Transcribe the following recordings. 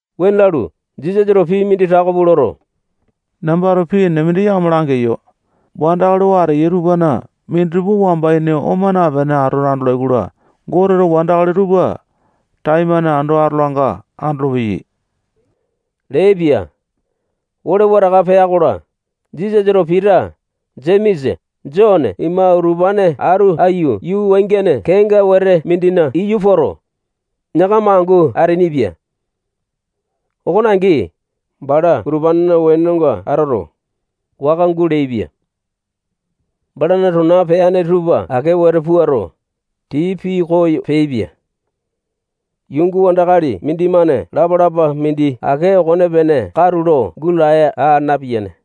Wuane lalu, Jisasato pii mindi tako pua loto, nambato pii enene mindi yakama langeyo. Wandakali oo ateya tupana minditupa wamba ini oma napene atoto andolai-kola, Goteto wandakali tupa taimane ando atolanga andolopeyai leaipia. Ole wataka pea-kola, Jisasato Pita, Jemesa, Jone ima utupane atu aiyu yuu wangiane kenga wete mindina iyu poto, yakama angu ateainipia. Okone angi, bala utupanena wenonga atoto, waka guleaipia. Balana tona peane tupa ake wete puato, tii pikoyo peaipia. Yuunga wandakali mindimane lapa-lapa mindi ake okonepene katulo gulaya aa napiyane.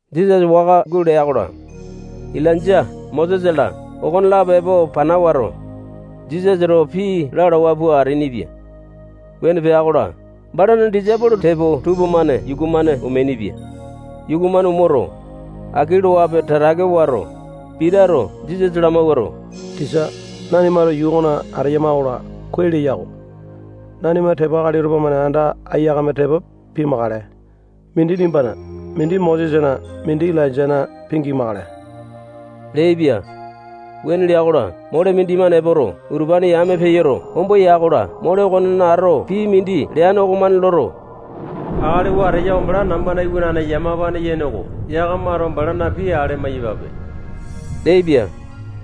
Jisasa waka gulea-kola, Ilainja, Mosesa-la, okonelapo epo pana wato, Jisasa towa pii lalawa pua ateainipia. Wuane pea-kola, balana disaipolo tepo tupamane yuku-mane omeainipia. Yuku-mane omoto, aki loape tatake wato, Pitato Jisasa lamawuato, tisa, nanimato yuu okona ateyama-kola, kuai leya-ko. Nanima tepo akali tupamane anda aiyakame tepo pimakale. Mindi nimbana, mindi Mosesana, mindi Ilainjana, pingimakale leaipia. Wuane lea-kola, mole mindimane epoto, utupane yame peyoto, ombo ya-kola, mole okonena ato pii mindi leane okomane loto, akali oo ateya oko bala namba iwanane yamapane yene oko. Yakamato balana pii ale amai-yapape leaipia.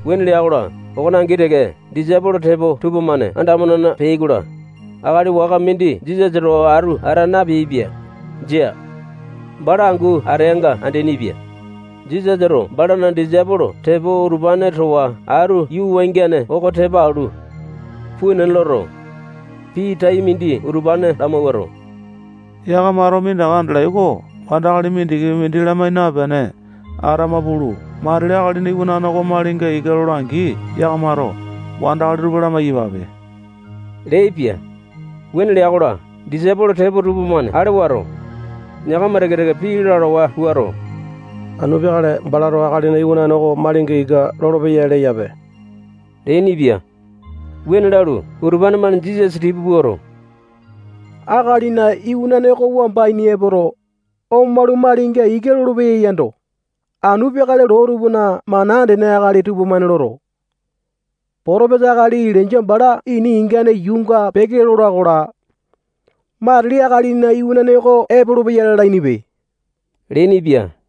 Wuane lea-kola, okone angi teke, disaipolo tepo tupamane anda amo-nena peai-kola, akali waka mindi Jisasa towa atu ata napeaipia. Jia. Bala angu ateanga andeaini-pia. Jisasato balana disaipolo tepo utupane towa atu yuu wangiane oko tepa alu, puu nena loto, pii tai mindi utupane lamawuato, yakamato minditaka andalai oko wandakali mindikipi mindi lamai napene atama pulu, matili Akalina Iwanane oko malinga ika lola-angi, yakamato wandakali tupa lamai-yapape leaipia. Wuane lea-kola, disaipolo tepo tupamane ale wato, yakama teke-teke pii lalawa puato, anu peakale balato Akalina Iwanane oko malinga ika lolopeya leyape leainipia. Wuane lalu, utupane-mane Jisasa tipa puato, Akalina Iwanane oko wamba ini epoto, omalu, malinga ika lolopeya yando, anu peakale loo tupana mana andene akali tupamane loto, potopesa akali Ilainja bala ini ingane yuunga peke lola-kola, matili Akalina Iwanane oko epolopeya lalainipe leainipia.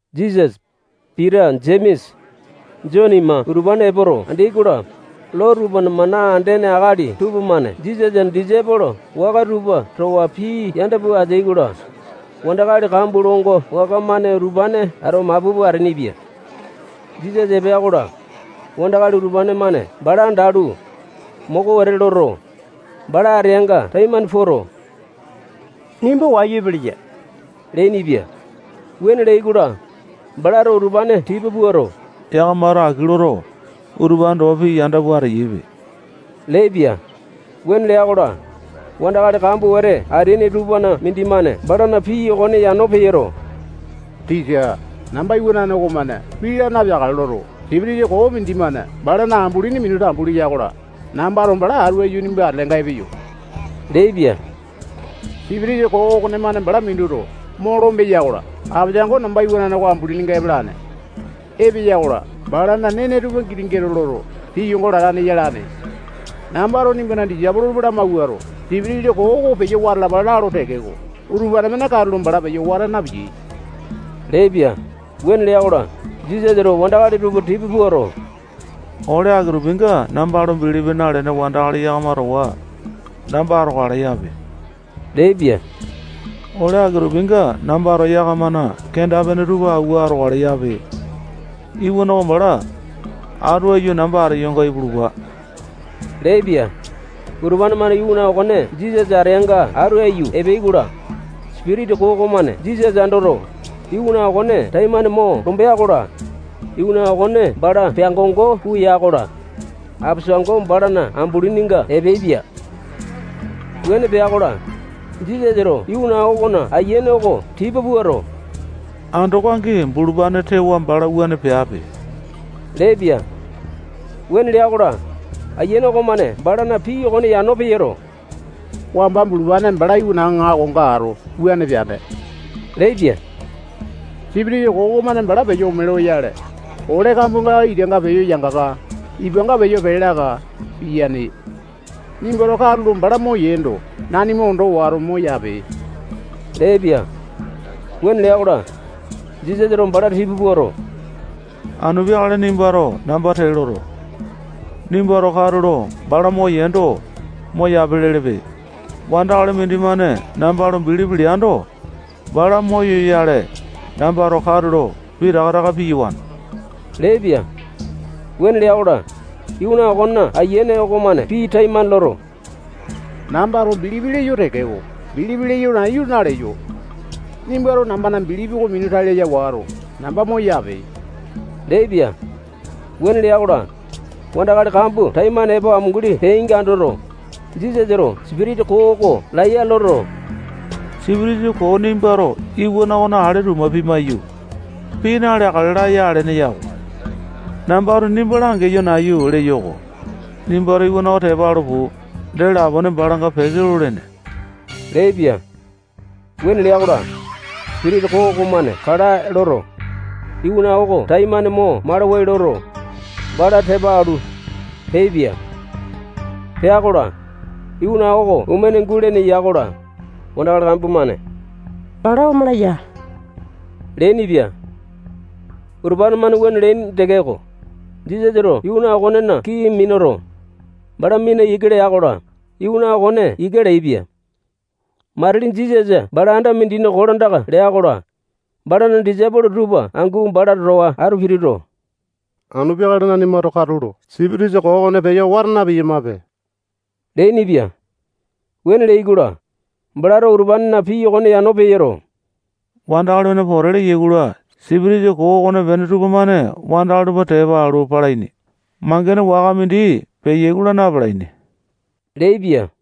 Jisasa, Pita, Jemesa, Jone ima utupane epoto andeai-kola, loo tupana mana andene akali tupamane Jisasana disaipolo waka tupa towa pii yanda pua ateai-kola, wandakali kambua longo waka-mane utupane ato mapu pua ateainipia. Jisasa epea-kola, wandakali utupane-mane bala andalu, moko wete loto, bala ateanga taimane poto, nimba wayu epeleya leainipia. Wuane leai-kola, balato utupane tipa puato, yakamato aki loto, utupane towa pii yanda pua ateyaipe leaipia. Wuane lea-kola, wandakali kambua wete ateaini tupana mindimane balana pii okone yano peyoto, tisa, namba iwanane okomane pii laa napeakale loto, sipitisa koo mindimane balana ambulini minu tambu leya-kola, nambato bala atu aiyu nimba atelenga epeyo leaipia. Sipitisa koo okonemane bala minuto, mo lombeya-kola, apesango namba iwanane oko ambulininga epalane. Epeya-kola, balana nene tupa giti gete loto, tiyongo latane yalane. Nambato nimbana disaipolo tupa lamawuato, sipitisa koo oko peyo wata alapa lalo tekeko, utupane-mane katulo bala peyo wata napiyai leaipia. Wuane lea-kola, Jisasato wandakali tupa tipa puato, ole aki-tupinga namba lo bilipi nalene wandakali yakama towa namba atokale yape leaipia. Ole aki-tupinga nambato yakamana kenda-pene tupa awua atokale yape. Iwana okone bala atu aiyu namba ateyonga ipulupa leaipia. Utupane-mane iwana okone Jisasa ateanga atu aiyu epeai-kola, sipitisa koo okomane Jisasa andoto, iwana okone taimane mo lombea-kola, iwana okone bala peango-ngo pua ya-kola, apesango balana ambulininga epeaipia. Wuane pea-kola, Jisasato iwana okona ayiane oko tipa puato, andoko angi bulupane tewa bala wuane peape leaipia. Wuane lea-kola, ayiane okomane balana pii okone yano peyoto, wamba bulupane bala iwana aŋakonga ato, wuane peane leaipia. Sipitisa koo okomane bala peyo ome loyale, ole kambuanga itanga peyo yangaka, ipanga peyo pee laka, piyane. Nimbato katulo bala moyeendo, nanima ondo wato, moyape leaipia. Wuane lea-kola, Jisasato bala tipa puato, anu peakale nimbato namba tee loto, nimbato katulo bala moyeendo, moyape lelepe. Wandakali mindimane namba lo bilipi leando, bala moyoyale nambato katulo pitaka taka piyawane leaipia. Wuane lea-kola, iwana okona ayiane okomane pii taimane loto, nambato bilipi leyo tekeko, bilipi leyo nayu naleyo. Nimbato nambana bilipi oko minu tai laya wato, namba moyape leaipia. Wuane lea-kola, wandakali kambua taimane epo amunguli peainga andoto, Jisasato sipitisa koo oko laiya loto, sipitisa koo, nimbato iwana okona ale tuma pimaiyu, pii naleakale laya alene yako. Nambato nimba langeyo nayu leyo-ko. Nimbato iwana oko tepa alu pulu, dee lapone balanga peke lolene leaipia. Wuane lea-kola, sipitisa koo okomane kalae loto, iwana oko taimane mo malawai loto, bala tepa alu, peaipia. Pea-kola, iwana oko omene gulene ya-kola, wandakali kambua-mane bala omala ya leainipia. Utupane-mane wuane leaini tekeko, Jisasato iwana okonena kii minuto, bala mina ika lea-kola, iwana okone ika leaipia. Matili Jisasa bala anda mindina kolandaka lea-kola, balana disaipolo tupa angu bala towa atu pituto, anu peakale nanimato katulo sipitisa koo okone peyo wata na-piyamape leainipia. Wuane leai-kola, balato utupanena pii okone yano peyoto, wandakali-mane pote leyai-kola, sipitisa koo okonepene tupamane wandakali tupa tepa alu, palaini. Mangene waka mindi peyai-kola, na-palaini leaipia.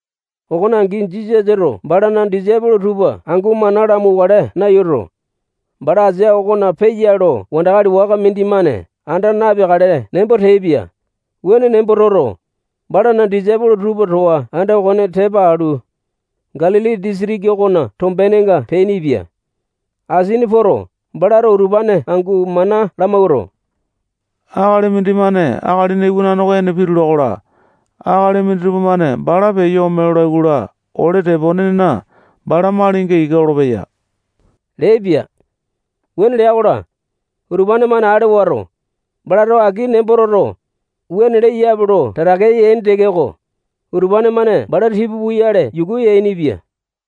Okone angi, Jisasato balana disaipolo tupa angu mana lamauwakale nayuto, bala asia okona peya lo wandakali waka mindimane anda napeakale nembo teaipia. Wuane nembo toto, balana disaipolo tupa towa anda okone tepa alu, Galili disitiki okona tombenga peainipia. Asini poto, balato utupane angu mana lamawuato, akali mindimane Akalina Iwanane oko ene pitula-kola, akali minditupa-mane bala peyo ome lolai-kola, ole teponena bala malinga ika lolopeya leaipia. Wuane lea-kola, utupane-mane ale wato, balato aki nembo toto, wuane leyape lo tatake yaini tekeko, utupane-mane bala tipa puyale yuku yainipia.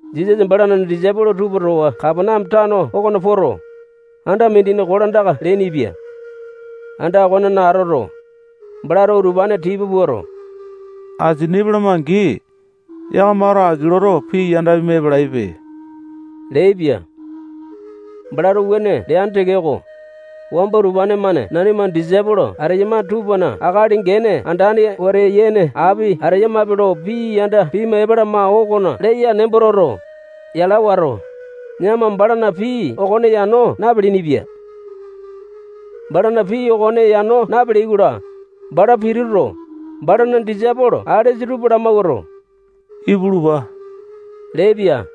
Jisasa balana disaipolo tupa towa Kapaneame tano okona poto, anda mindina kolandaka leainipia. Anda okonena atoto, balato utupane tipa puato, asini epalama-angi, yakamato aki loto, pii yanda pima epalaipe leaipia. Balato wuane leane tekeko, wamba utupane-mane nanima disaipolo ateyama tupana akali gene andane wete yene api ateyamape lo pii yanda pima epalama okona leya nembo toto, yala wato, yakama balana pii okone yano napeleaini-pia. Balana pii okone yano napeleai-kola, bala pituto, balana disaipolo alesa tupa lamawuato, ipulupa leaipia.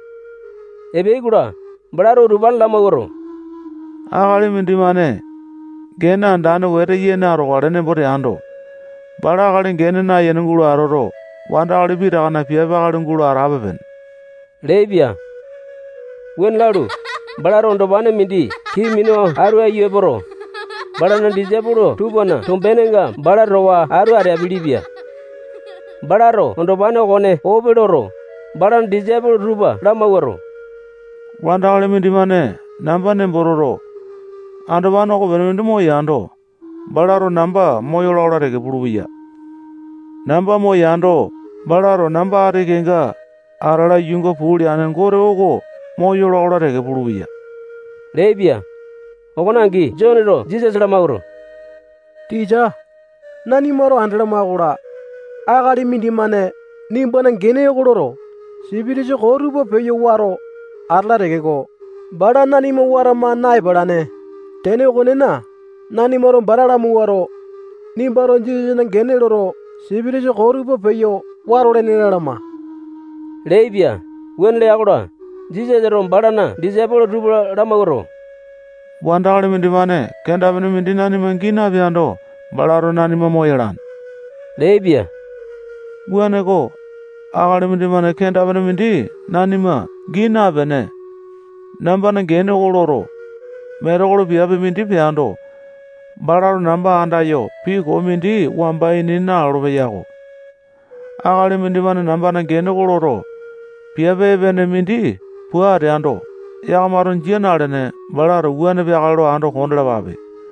Epeai-kola, balato utupane lamawuato, akali mindimane gene andane wete yene atokale nembo teando, bala akali gene nayene gulo atoto, wandakali pitakana piape akali gulo atape-pene leaipia. Wuane lalu, balato andopane mindi kii minu atu aiyu epoto, balana disaipolo tupana tombenenga bala towa atu ateapele-pia. Balato andopane okone ope loto, balana disaipolo tupa lamawuato, wandakali mindimane namba nembo toto, andopane okopene mindi moyando, balato namba moyola-kola teke pulupeya. Namba moyando, balato namba ati kenga atala yuunga puu leane Gote oko moyola-kola teke pulupeya leaipia. Okone angi, Joneto Jisasa lamawuato, tisa, nanimato andalama-kola, akali mindimane nimbana gene oko loto, sipitisa koo tupa peyo wato atala tekeko, bala nanima watama na-epalane. Tene okonena, nanimato bala lamawuato, nimbato Jisasana gene loto, sipitisa koo tupa peyo watolene lalama leaipia. Wuane lea-kola, Jisasato balana disaipolo tupa lamawuato, wandakali mindimane kenda-pene mindi nanima gii napeando, balato nanima moyalane leaipia. Wuaneko, akali mindimane kenda-pene mindi nanima gii napene, nambana gene oko loto, metekolo piape mindi peando, balato namba andayo pii koo mindi wamba ini nalolo-peyako. Akali mindimane nambana gene oko loto, piape epene mindi pua ateando, yakamato jia nalene, balato wuane peakale lo ando kondalapape.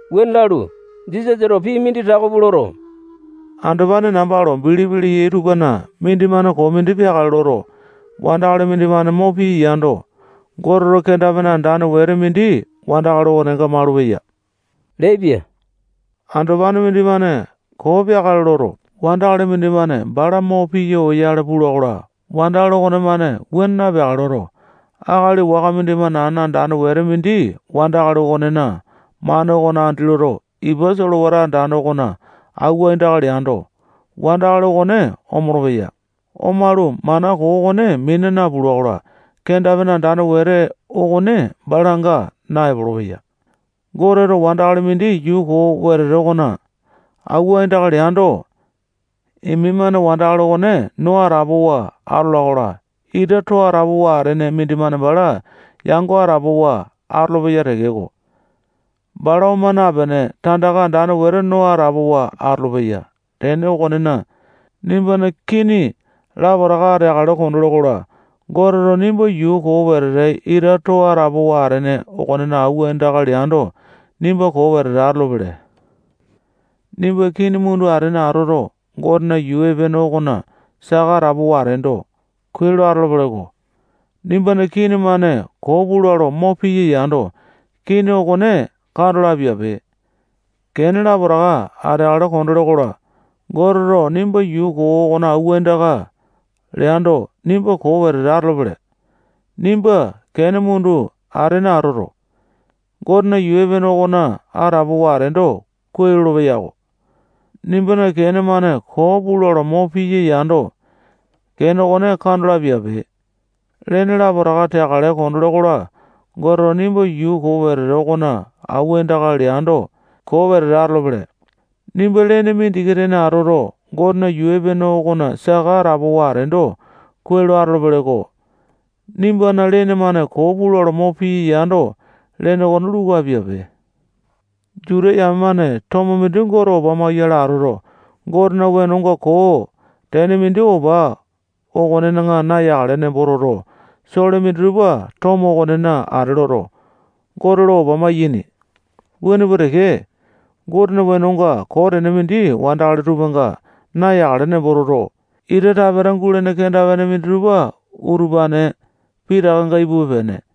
Wuane lalu, Jisasato pii mindi tako pua loto, andopane namba lo bilipi leyai tupana mindimane koo mindi peakale loto, wandakali mindimane mo piya yando, Goteto kenda-pene andane wete mindi wandakali okonenga malupeya leaipia. Andopane mindimane koo peakale loto, wandakali mindimane bala mo piya oyale pula-kola, wandakali okonemane wuane napeakale loto, akali waka mindimane ana andane wete mindi wandakali okonena mane okona andi loto, ipa solewata andane okona awua aindaka leando, wandakali okone omolo-peya. Omalu, mana koo okone mina napula-kola, kenda-pene andane wete okone balanga naepolo-peya. Goteto wandakali mindi yuu koo wetete okona awua aindaka leando, imi-mane wandakali okone no atapowa atola-kola, ita too atapowa atene mindimane bala yango atapowa atolopeya tekeko, bala oma napene, tandaka andane wetete no atapowa atolopeya. Tene okonena, nimbana kini lapotaka ateakale kondole-kola, Goteto nimba yuu koo wetete ita too atapowa atene okonena awua aindaka leando, nimba koo wetete atolopele. Nimba kini mundu atene atoto, Gotena yuu epene okona saka atapowa ateendo, kuai lolopeya-ko. Nimbana kini-mane koo pula lo mo piya yando, kini okone kando lo apiape. Kene lapotaka ateakale kondole-kola, Goteto nimba yuu koo okona awua aindaka leando, nimba koo wetete atolopele. Nimba kene mundu atene atoto, Gotena yuu epene okona atapowa ateendo, kuai lolopeya-ko. Nimbana kene-mane koo pula lo mo piya yando, kene okone kando lo apiape. Lene lapotaka teakale kondole-kola, Goteto nimba yuu koo wetete okona awua aindaka leando, koo wetete atolopele. Nimba lene mindiki tene atoto, Gotena yuu epene okona saka atapowa ateendo, kuai lolopeya-ko. Nimbana lene-mane koo pula lo mo piya yando, lene okone luku apiape. Juta yame-mane tomo mindi Gote opa mawua-yale atoto, Gotena wenonga koo tene mindi opa okonena nayakale nembo toto, sole minditupa tomo okonena ate loto, Gote lo opa maiyaini. Wuane pua teke, Gotena wenonga koo tene mindi wandakali tupanga nayakale nembo toto, ita tapeta gulene kenda-pene minditupa utupane pitakanga ipupe-pene.